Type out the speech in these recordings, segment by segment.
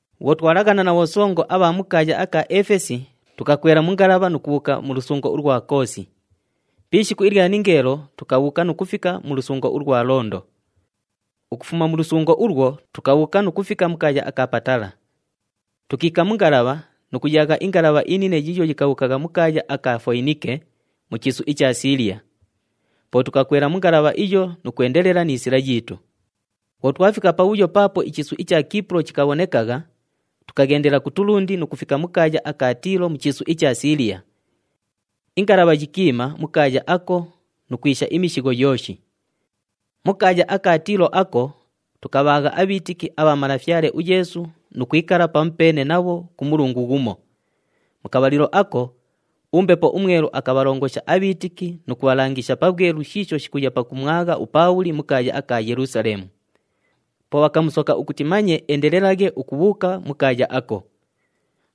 Bhwo twalaghana na bhosongo abha mu kaaya aka Efesi, tukakwela mu ngalabha nu kubhuuka mu lusungo ulwa Koosi. Pi ishiku ilya ningeelo tukabhuuka nu kufika mu lusungo ulwa Londo. Ukufuma mu lusungo ulwo, tukabhuuka nu kufika mu kaaya aka Patala. Tukiika mu ngalabha nu kuyaagha ingalabha inine yiiyo yikabhuukagha mu kaaya aka Foyinike, mu chiisu icha Siiliya. Po tukakwela mu ngalabha iyo nu kwendelela ni sila yiitu. Bhwo twafika pabhuyo paapo ichiisu icha Kiipulo chikabhonekagha, tukaghendela kutulundi nu kufika mu kaaya aka Tiilo mu chiisu icha Siiliya. Ingalabha yikiima mu kaaya ako nu kwisha imishigho yooshi. Mu kaaya aka Tiilo ako, tukabhaagha abhiitiki abha Malafyale uYeesu nu kwikala pamupeene nabho ku mulungu ghumo. Mu kabhalilo ako, uMbepo uMwelu akabhalongosha abhiitiki nu kubhalangisha pabhwelu shiisho shikuya pakumwagha uPaabhuli mu kaaya aka Yelusaleemu. Po bhakamusoka ukuti manye eendelelaghe ukubhuuka mu kaaya ako.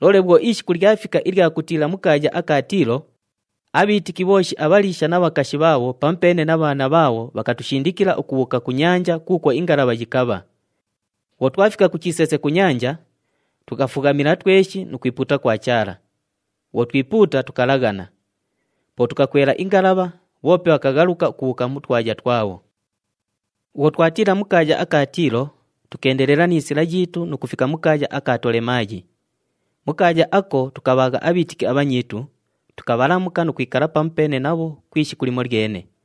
Loole bhwo ishiku lyafika ilya kutiila mu kaaya aka Tiilo, abhiitiki bhooshi abhaliisha na bhakashi bhaabho pamupeene na bhaana bhaabho bhakatushindikila ukubhuuka ku nyanja kuukwo ingalabha yikabha. Bhwo twafika ku chiseese ku nyanja, tukafughamila tweshi nu kwipuuta kwa Chaala. Bhwo twipuuta, tukalaghana. Po tukakwela ingalabha, bhoope bhakaghaluka ukubhuuka mu twaya twabho. Bhwo twatiila mu kaaya aka Tiilo, tukeendelela ni sila yiitu nu kufika mu kaaya aka Tolemaayi. Mu kaaya ako, tukabhaagha abhiitiki abhanyiitu, tukabhalamuka nu kwikala pamupeene nabho ku ishiku limolyene.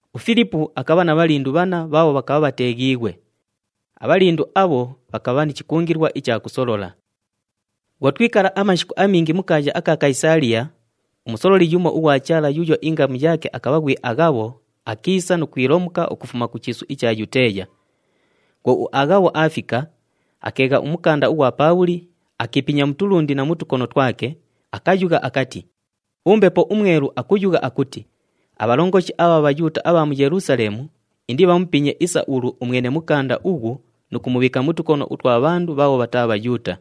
UFilipu akabha na bhalindu bhanna bhaabho bhakabha bhateeghiighwe. Abhalindu abho bhakabha ni chikungilwa icha kusolola. Bhwo twikala amashiku amingi mu kaaya aka Kayisaaliya, umusololi yumo ughwa Chaala yuuyo ingamu yaake akabha ghwi Aghabho akiisa nu kwilomuka ukufuma ku chiisu icha Yuteeya. Bhwo uAghabho aafika, akeegha umukanda ughwa Paabhuli, akiipinya mu tulundi na mu tukono twake, akayugha akati, “UMbepo uMwelu akuyugha akuti, ‘Abhalongoshi abha Bhayuuta abha mu Yelusaleemu indibhamupinye isa ulu umwene mukanda ughu nu kumubhiika mu tukono utwa bhandu bhaabho bhataa Bhayuuta.’”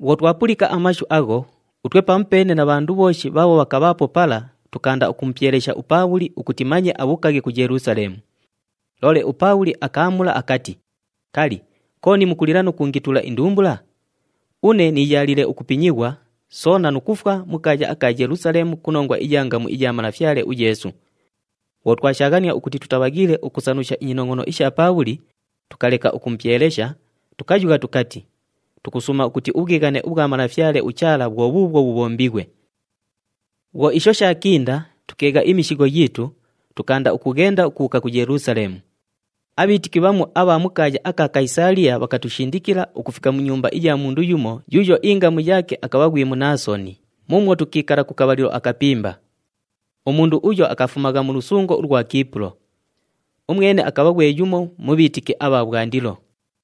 Bhwo twapulika amashu agho, utwe pamupeene na bhandu bhooshi bhaabho bhakabhaapo pala tukaanda ukumupyelesha uPaabhuli ukuti manye abhuukaghe ku Yelusaleemu. Loole uPaabhuli akaamula akati, “Kali, kooni mukulila nu kuungitula indumbula? Une niiyaaliile ukupinyighwa, soona nu kufwa mu kaaya aka Yelusaleemu ku nongwa iya ngamu iya Malafyale uYeesu.” Bhwo twashaaghania ukuti tutabhaghiile ukusanusha inyinongʼono isha Paabhuli, tukaleka ukumupyelesha, tukayugha tukati, “Tukusuuma ukuti ubhwighane ubhwa Malafyale uChaala bhwo bhuubhwo bhubhombighwe.” Bhwo isho shaakinda, tukeegha imishigho yiitu, tukaanda ukughenda ukubhuuka ku Yelusaleemu. Abhiitiki bhamu abha mu kaaya aka Kayisaaliya bhakatushindikila ukufika mu nyumba iya mundu yumo yuuyo ingamu yaake akabha ghwi Munaasoni muumwo tukiikala ku kabhalilo akapimba. Umundu uyo akafumagha mu lusungo ulwa Kiipulo. Umwene akabha ghwe yumo mu bhiitiki abha bhwandilo.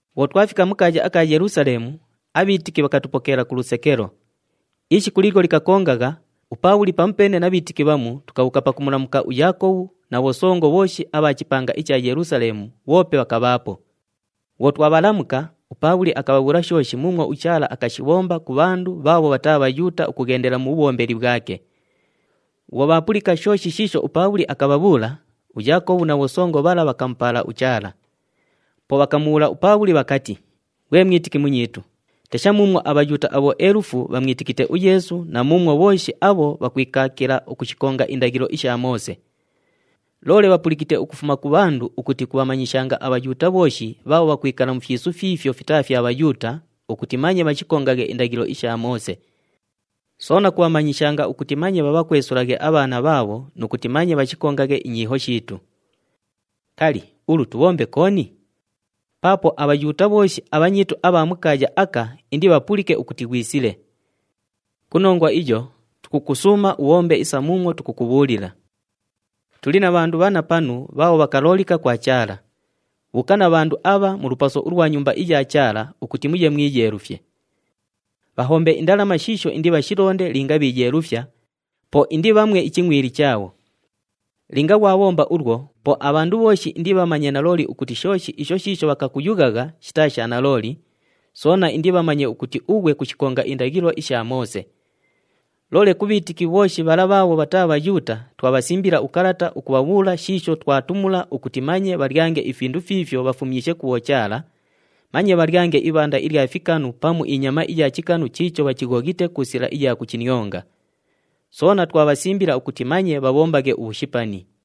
Bhwo twafika mu kaaya aka Yelusaleemu, abhiitiki bhakatupokeela ku lusekelo. Ishiku liilyo likakongagha, uPaabhuli pamupeene na bhanyiitu bhamu tukabhuuka pakumulamuka uYaakobhu na bhosongo bhooshi abha chipanga icha Yelusaleemu bhoope bhakabhaapo. Bhwo twabhalamuka, uPaabhuli akabhabhuula shooshi muumwo uChaala akashibhomba ku bhandu bhaabho bhataa Bhayuuta ukughendela mu bhubhombeli bhwake. Bhwo bhaapulika shooshi shiisho uPaabhuli akabhabhuula, uYaakobhu na bhosongo bhala bhakamupaala uChaala. Po bhakamubhuula uPaabhuli bhakati, “Ghwe mwitiki munyiitu, tesha muumwo aBhayuuta abhoelufu bhamwitikite uYeesu na muumwo bhooshi abho bhakwikaakila ukushikonga indaghilo isha Moose. Loole bhapulikite ukufuma ku bhandu ukuti kubhamanyishanga aBhayuuta bhooshi bhaabho bhakwikala mu fyisu fiifyo fitaa fya Bhayuuta ukuti manye bhashikongaghe indaghilo isha Moose. Soona kubhamanyishanga ukuti manye bhabhakwesulaghe abhaana bhaabho nu kuti manye bhashikongaghe inyiiho shiitu. Kali, ulu tubhombe kooni? Paapo aBhayuuta bhooshi abhanyiitu abha mu kaaya aka indibhapulike ukuti ghwisile. Ku nongwa iyo, tukukusuuma ubhombe isa muumwo tukukubhuulila. Tuli na bhandu bhanna panu bhaabho bhakaloolika kwa Chaala. Bhuuka na bhandu abha mu lupaso ulwa Nyumba iya Chaala ukuti muye mwiyeelufye. Bhahombe indalama shiisho indibhashilonde linga bhiiyeelufya, po indibhamwe ichingʼwili chaabho. Linga ghwabhomba ulwo, po abhandu bhooshi indibhamanye nalooli ukuti shooshi isho shiisho bhakakuyughagha shitaa sha nalooli, soona indibhamanye ukuti ughwe kushikonga indaghilo isha Moose. Loole ku bhiitiki bhooshi bhala bhaabho bhataa Bhayuuta, twabhasimbila ukalata ukubhabhuula shiisho twatumula, ukuti manye bhalyange ifindu fiifyo bhafumyishe ku bhochaala, manye bhalyange ibhanda ilya fikanu pamu inyama iya chikanu chiicho bhachighoghite ku sila iya kuchinionga. Soona twabhasimbila ukuti manye bhabhombaghe ubhushipani.”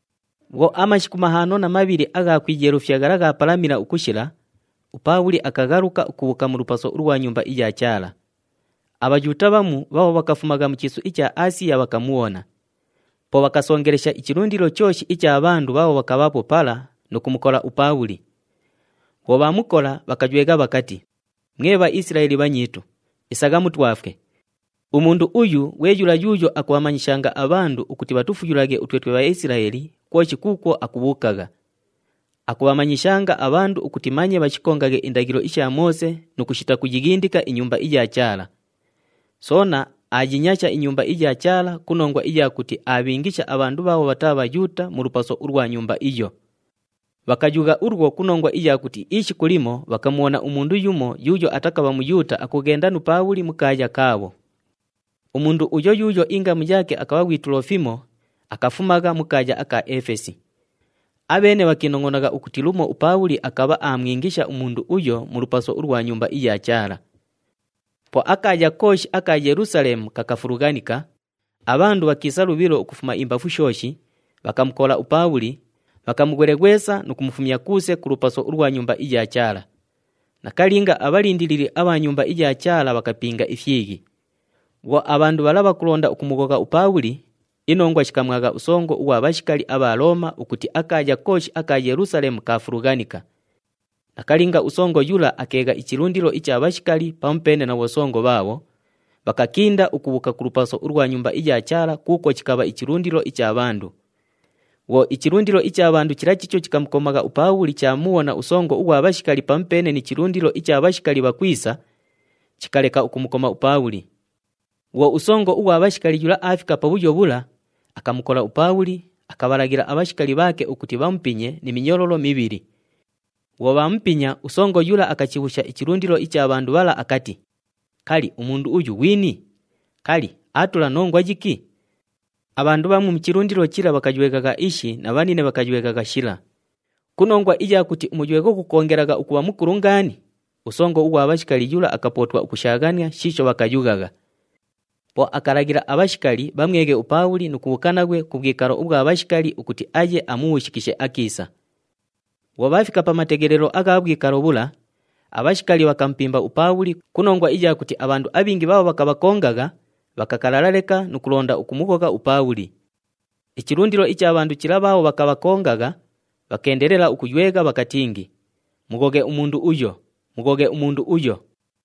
Bhwo amashiku mahaano na mabhili agha kwiyeelufya ghala ghaapalamila ukushila, uPaabhuli akaghaluka ukubhuuka mu lupaso ulwa Nyumba iya Chaala. ABhayuuta bhamu bhaabho bhakafumagha mu chiisu icha Aasiya bhakamubhona. Po bhakasongelesha ichilundilo chooshi icha bhandu bhaabho bhakabhaapo pala nu kumukola uPaabhuli. Bhwo bhaamukola, bhakaywegha bhakati, “Mwe Bhaisilaeli bhanyiitu, isagha mutwafwe! Umundu uyu ghwe yula yuuyo akumanyishanga abhandu ukuti bhatufuyulaghe utwe twe Bhaisilaeli kwoshi kuukwo akubhuukagha. Akumanyishanga abhandu ukuti manye bhashikongaghe indaghilo isha Moose nu kushita kuyighindika iNyumba iya Chaala. Soona aayinyasha iNyumba iya Chaala ku nongwa iya kuti aabhiingisha abhandu bhaabho bhataa Bhayuuta mu lupaso ulwa Nyumba iyo.” Bhakayugha ulwo ku nongwa iya kuti ishiku limo bhakamubhona umundu yumo yuuyo atakabha Muyuuta akughenda nu Paabhuli mu kaaya kaabho. Umundu uyo yuuyo ingamu yaake akabha ghwi Tulofimo, akafumagha mu kaaya aka Efesi. Abheene bhakiinongʼonagha ukuti lumo uPaabhuli akabha aamwingisha umundu uyo mu lupaso ulwa Nyumba iya Chaala. Po akaaya kooshi aka Yelusaleemu kakafulughanika, abhandu bhakiisa lubhilo ukufuma imbafu shooshi, bhakamukola uPaabhuli, bhakamughweleghwesa nu kumufumya kuuse ku lupaso ulwa Nyumba iya Chaala. Nakalinga, abhalindilili abha Nyumba iya Chaala bhakapinga ifyighi. Bhwo abhandu bhala bhakulonda ukumughogha uPaabhuli, inongwa shikamwagha usongo ughwa bhashikali abha Looma ukuti akaaya kooshi aka Yelusaleemu kaafulughanika. Nakalinga, usongo yula akacheegha ichilundilo icha bhashikali pamupeene na bhosongo bhaabho, bhakakinda ukubhuuka ku lupaso ulwa Nyumba iya Chaala kuukwo chikabha ichilundilo icha bhandu. Bhwo ichilundilo icha bhandu chila chiicho chikamukomagha uPaabhuli chaamubhona usongo ughwa bhashikali pamupeene ni chilundilo icha bhashikali bhakwisa, chikaleka ukumukoma uPaabhuli. Bhwo usongo ughwa bhashikali yula aafika pabhuyo bhula, akamukola uPaabhuli, akabhalaghila abhashikali bhaake ukuti bhamupinye ni minyololo mibhili. Bhwo bhaamupinya, usongo yula akachibhuusha ichilundilo icha bhandu bhala akati, “Kali, umundu uyu ghwini? Kali, aatula nongwa yiki?” Abhandu bhamu mu chilundilo chila bhakayweghagha ishi na bhanine bhakayweghagha shila. Ku nongwa iya kuti umuywegho ghukoongelagha ukubha mukulu ngaani, usongo ughwa bhashikali yula akapootwa ukushaaghania shiisho bhakayughagha. Po akalaghila abhashikali bhamweghe uPaabhuli nu kubhuuka naghwe ku bhwikalo ubhwa bhashikali ukuti aye amubhuushikishe akiisa. Bhwo bhaafika pa mateghelelo agha bhwikalo bhula, abhashikali bhakamupimba uPaabhuli ku nongwa iya kuti abhandu abhingi bhaabho bhakabhakongagha, bhakakalala leka nu kulonda ukumughogha uPaabhuli. Ichilundilo icha bhandu chila bhaabho bhakabhakongagha, bhakeendelela ukuywegha bhakatingi, “Mughoghe umundu uyo! Mughoghe umundu uyo!”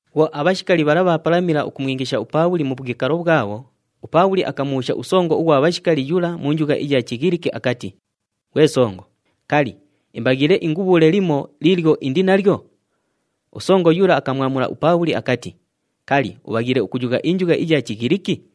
Bhwo abhashikali bhala bhaapalamila ukumwingisha uPaabhuli mu bhwikalo bhwabho, uPaabhuli akamubhuusha usongo ughwa bhashikali yula mu njugha iya Chighiliki akati, “Ghwe songo, kali, imbaghiile ingubhuule limo liilyo indi nalyo?” Usongo yula akamwamula uPaabhuli akati, “Kali, ubhaghiile ukuyugha injugha iya Chighiliki?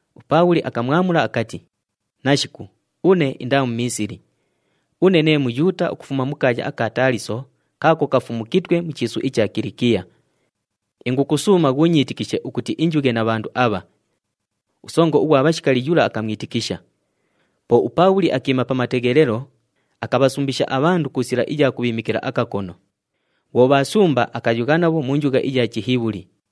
UPaabhuli akamwamula akati, “Nashiku, une indaa Mumiisili. Une nee Muyuuta ukufuma mu kaaya aka Taaliso kaako kafumukitwe mu chiisu icha Kilikiya. Ingukusuuma ghuunyiitikishe ukuti injughe na bhandu abha.” Usongo ughwa bhashikali yula akamwitikisha. Po uPaabhuli akiima pa mateghelelo, akabhasumbisha abhandu ku sila iya kubhiimikila akakono. Bhwo bhaasumba, akayugha nabho mu njugha yaabho iya Chihibhuli.